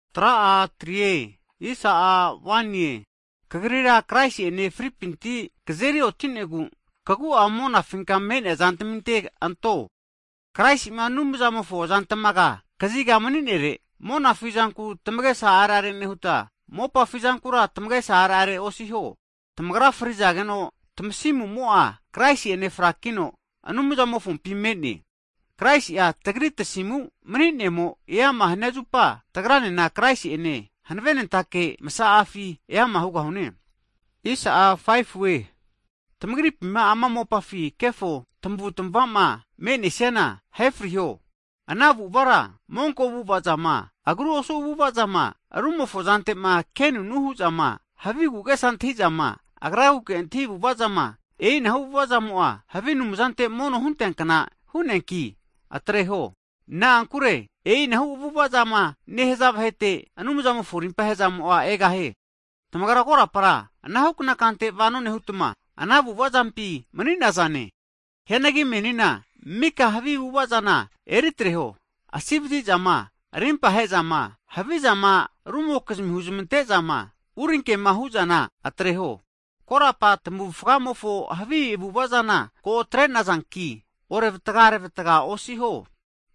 Hagi tamagrira Kraisi'ene fripinti Anumzamo'a tamazeri oti'negu, tamagu'a monafinka me'nea zantaminte anteho, Kraisi'ma Anumzamofo azantamaga kazigama mani'nere. Monare zanku tamagesa areare nehuta, mopafi zankura tamagesa arerera osiho. Tamagra frizageno, tamasimumo'a Kraisi'ene frakino Anumzamofompi me'ne. Hagi Kraisi'a tagri tasimu mani'nemo eama hania zupa, tagranena Kraisi'ene hanavenentake masazama'afi eama hugahune. E'ina hu'negu tamagripima ama mopafi kefo tamavutamava zama me'nesiana ahefriho. Ana avu'avara monko avu'avazama, agru osu avu'avazama, rumofo zantema kenunu hu'zama, havi agu'agesa antahizama, agraguke antahi avu'avazane, e'inahu avu'avazamo'a havi anumzante mono hunteankna hu'neanki atreho. Na'ankure e'inahu avu'ava'ma nehaza vahete Anumzamofo rimpahezamo'a egahie. Tamagra korapara anahukna kante vono nehutma, ana avu'avazampi mani'nazane. Hianagi menina mika havi avu'ava zana eritreho, havi asivazi'zama rimpahe'zama, havizama rumokizmi huzmante'zama, urinkema vahe'ma huzmante'zana atreho. Korapa tamavufgamofo havi avu'ava zana ko atrenazanki, orevatga arevatga osiho.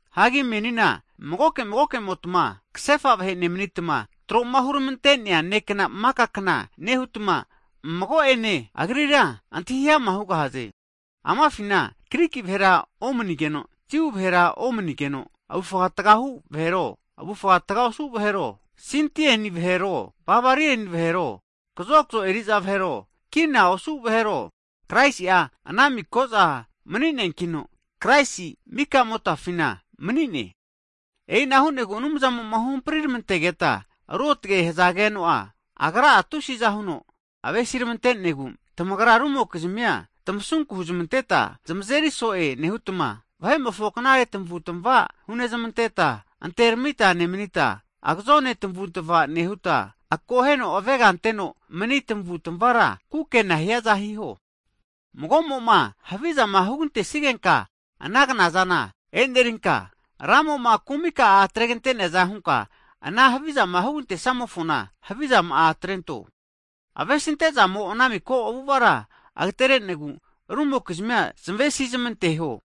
Hagi menina magoke magoke'motma kasefa vahe nemanitma, troma huramante'nea nekna maka kna nehutma, mago'ene agrira antahi ama hugahaze. Amafina Griki vahera omanigeno Jiu vahera omanigeno, avufga taga hu'nea vahero, avufga taga osu vahero, Sinti vahero, Barberia vahero, kazokzo eri'za vahero, kina osu vahero, Kraisi'a ana miko'za mani'neankino, Kraisi mikamotafina mani'ne. E'ina hu'negu Anumzamo'ma huhampri ramantegeta ruotge hazageno'a, Agra tusiza huno avesiramantenegu, tamagra rumokizmia tamasunku huzmanteta zamazeri so'e nehutma, vahe'mofo knare tamavu'tamava hunezmanteta, anteramita nemanita, agazone tamavutamava nehuta, akoheno avega anteno mani tamavutmavara kukena hiaza hiho. Mago'moma havizama hugantenesigenka ana knazana e'nerinka, Ramo'ma kumika'a atreganteneaza hunka ana havizama hugantenesimofona, havizama'a atrento. Avesimantezamo ana miko avu'avara agaterenegu, rumokizmi zamavesizamanteho.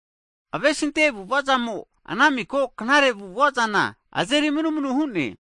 Avesi'ante avu'vazamo ana miko knare avu'ava zana azeri manumanu hu'ne.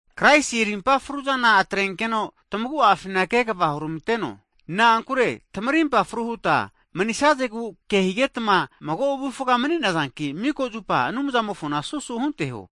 Kraisi rimpa fruzana atrenkeno tamagu'afina kegava hurmanteno, na'ankure tamarimpa fru huta manisazegu kehigetma mago avufga mani'nazanki, miko zupa Anumzamofona susu hunteho.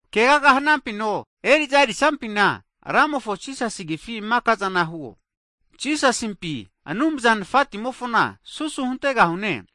Kegagama hanafino, eri'zama erisafinena, Rantimofo Jisasi agifi maka'zana hiho. Jisasimpi Anumza Nafatimofona susu huntegahune.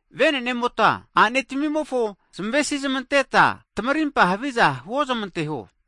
Venenemota a'netamimofona zamavesinezamanteta, tamarimpa haviza huozmanteho.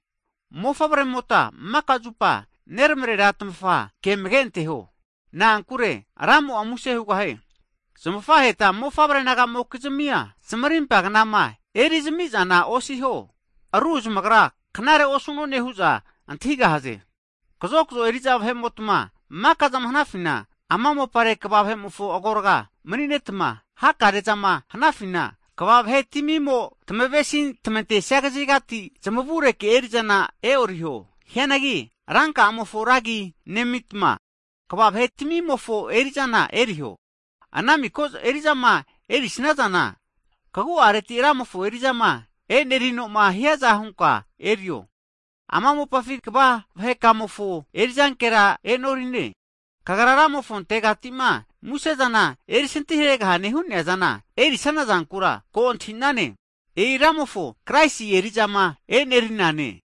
Mofavre'mota mika zupa neramarera tamafa ke amage anteho, na'ankure Ramo'a muse hugahie. Zamafaheta mofavre nagamokizmia zamarimpa knama erizamizana osiho, ru zamagra knarera osu'none hu'za antahigahaze. Hagi kazokzo eri'za vahe'motma maka'zama hanafina ama mopare kva vahe'mofo agorga'a mani'netma hakare'a zama hanafina kva vahe tamimo'ma tamavesi tamantesia kazigati, zamavureke eri'zana e'oriho. Hianagi Rantamimofo ra agi nemitma, tamagu'areti hutma kvatamimofo eri'zana eriho. Ana miko eri'zama erisazana, tamagu'areti huta Ramofo eri'zanki erinteho. Ama mopafi kva vahetamimofo eri'zana e'norize. Tamagra Ramofontegatima musezama erisintiharegahaze hu'nea zama erisanaza zana ko antahi'naze. E'i Ramofo Kraisi eri'za e'nerize.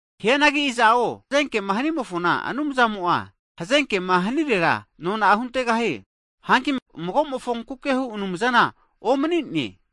Hianagi iza'o hazenkema hanimofona, Anumzamo'a hazenkema hanirera nona'a huntegahie, hagi magomofonkuke hu Anumzana omani'ne.